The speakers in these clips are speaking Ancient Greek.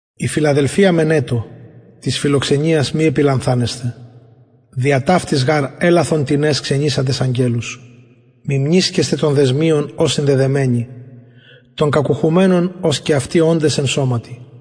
η φιλαδελφια μενετω της φιλοξενιας μη επιλανθανεσθε δια ταυτης γαρ ελαθον τινες ξενισαντες αγγελους μιμνησκεσθε των δεσμιων ως συνδεδεμενοι των κακουχουμενων ως και αυτοι οντες εν σωματι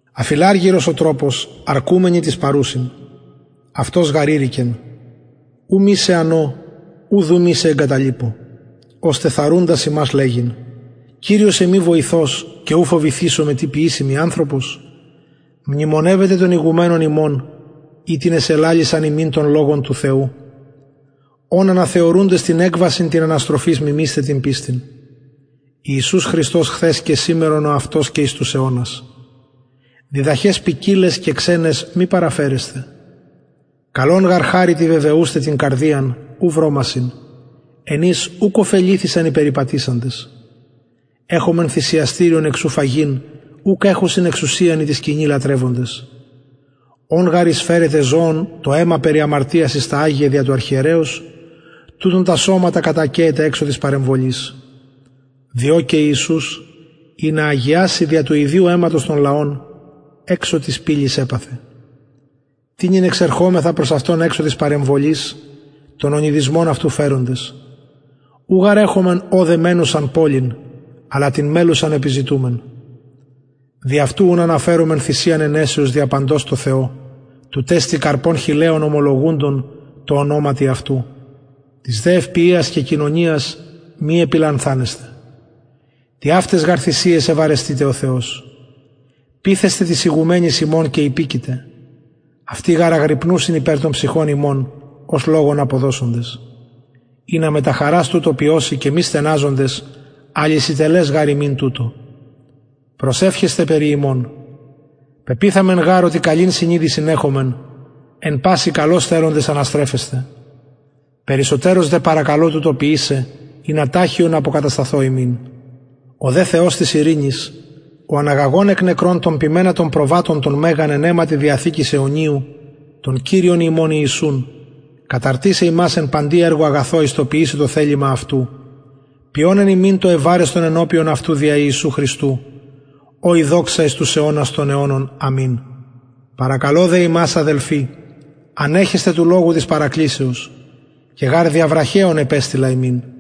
αφιλαργυρος ο τροπος αρκουμενοι τοις παρουσιν αυτος γαρ ειρηκεν ου μη σε ανω ουδ ου μη σε εγκαταλειπω ωστε θαρρουντας ημας λεγειν κυριος εμοι βοηθος και ου φοβηθησομαι τι ποιησει μοι ανθρωπος μνημονευετε των ηγουμενων υμων οιτινες ελαλησαν υμιν τον λογον του θεου ων αναθεωρουντες την εκβασιν της αναστροφης μιμεισθε την πιστιν ιησους χριστος χθες και σημερον ο αυτος και εις τους αιωνας διδαχαις ποικιλαις και ξεναις μη παραφερεσθε καλον γαρ χαριτι βεβαιουσθαι την καρδιαν ου βρωμασιν εν οις ουκ ωφεληθησαν οι περιπατησαντες εχομεν θυσιαστηριον εξ ου φαγειν ουκ εχουσιν εξουσιαν οι τη σκηνη λατρευοντες ων γαρ εισφερεται ζωων το αιμα περι αμαρτιας εις τα αγια δια του αρχιερεως τουτων τα σωματα κατακαιεται εξω της παρεμβολης διο και ιησους ινα αγιαση δια του ιδιου αιματος τον λαον εξω της πυλης επαθεν τοινυν εξερχωμεθα προς αυτον εξω της παρεμβολης τον ονειδισμον αυτου φεροντες ου γαρ εχομεν ωδε μενουσαν πολιν αλλα την μελλουσαν επιζητουμεν δι αυτου ουν αναφερωμεν θυσιαν αινεσεως δια παντος τω θεω τουτ εστιν καρπον χειλεων ομολογουντων τω ονοματι αυτου της δε ευποιιας και κοινωνιας μη επιλανθανεσθε τοιαυταις γαρ θυσιαις ευαρεστειται ο θεος πειθεσθε τοις ηγουμενοις υμων και υπεικετε αυτοι γαρ αγρυπνουσιν υπερ των ψυχων υμων ως λογον αποδωσοντες ινα μετα χαρας τουτο ποιωσιν και μη στεναζοντες αλυσιτελες γαρ υμιν τουτο προσευχεσθε περι ημων πεποιθαμεν γαρ οτι καλην συνειδησιν εχομεν εν πασιν καλως θελοντες αναστρεφεσθαι περισσοτερως δε παρακαλω τουτο ποιησαι ινα ταχιον αποκατασταθω υμιν ο δε θεος της ειρηνης ο αναγαγων εκ νεκρων τον ποιμενα των προβατων τον μεγαν εν αιματι διαθηκης αιωνιου τον κυριον ημων ιησουν καταρτισαι υμας εν παντι εργω αγαθω εις το ποιησαι το θελημα αυτου ποιων εν υμιν το ευαρεστον ενωπιον αυτου δια ιησου χριστου ω η δοξα εις τους αιωνας των αιωνων αμην παρακαλω δε υμας αδελφοι ανεχεσθε του λογου της παρακλησεως και γαρ δια βραχεων επεστειλα υμιν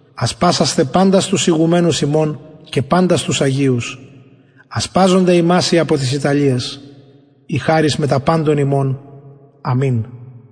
ασπασασθε παντας τους ηγουμενους υμων και παντας τους αγιους ασπαζονται υμας οι απο της ιταλιας η χαρις μετα παντων υμων αμην